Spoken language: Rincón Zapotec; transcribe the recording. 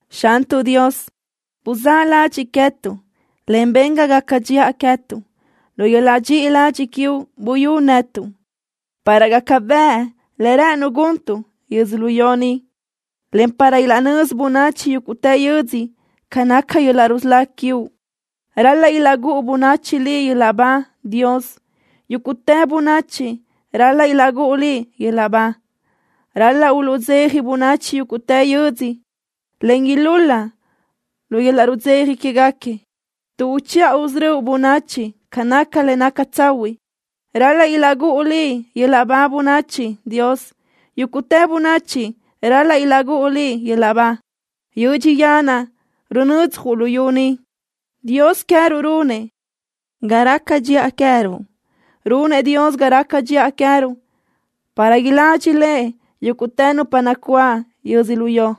Xantuʼ Dios, buzáʼ ladxiʼ queë́tuʼ, en ben ga gaca dxiʼa queë́tuʼ. Lu yöl-laʼ dxiʼi ladxiʼ quiuʼ buyú netuʼ, para gaca bëʼ le rë́ʼënuʼ guntuʼ yödzölió ni, en para ilaʼnözi bönachi yúguʼtë yödzö ca naca yöl-laʼ rusölá quiuʼ. Ral-laʼ ilaʼgúʼu bönachi Liʼ yöl-laʼ ba, Dios. Yúguʼtë bönachi ral-laʼ ilaʼgúʼu Liʼ yöl-laʼ ba. Ral-laʼ uluʼdzeja bönachi yúguʼtë yödzö, en ilúl-la lu yöl-laʼ rudzeja quéguequi. Tuʼ uchiʼa usörö́uʼ bönachi ca naca le naca tsahuiʼ, ral-laʼ ilaʼgúʼu Liʼ yöl-laʼ ba bönachi, Dios. Yúguʼtë bönachi ral-laʼ ilaʼgúʼu Liʼ yöl-laʼ ba. Yödxi yanaʼ runödzaj luyú ni. Dios queë́ruʼ runëʼ ga raca dxiʼa queë́ruʼ. Runëʼ Dios ga raca dxiʼa queë́ruʼ, para iladxi Lëʼ yúguʼtë nupa nacuáʼ yödzölió.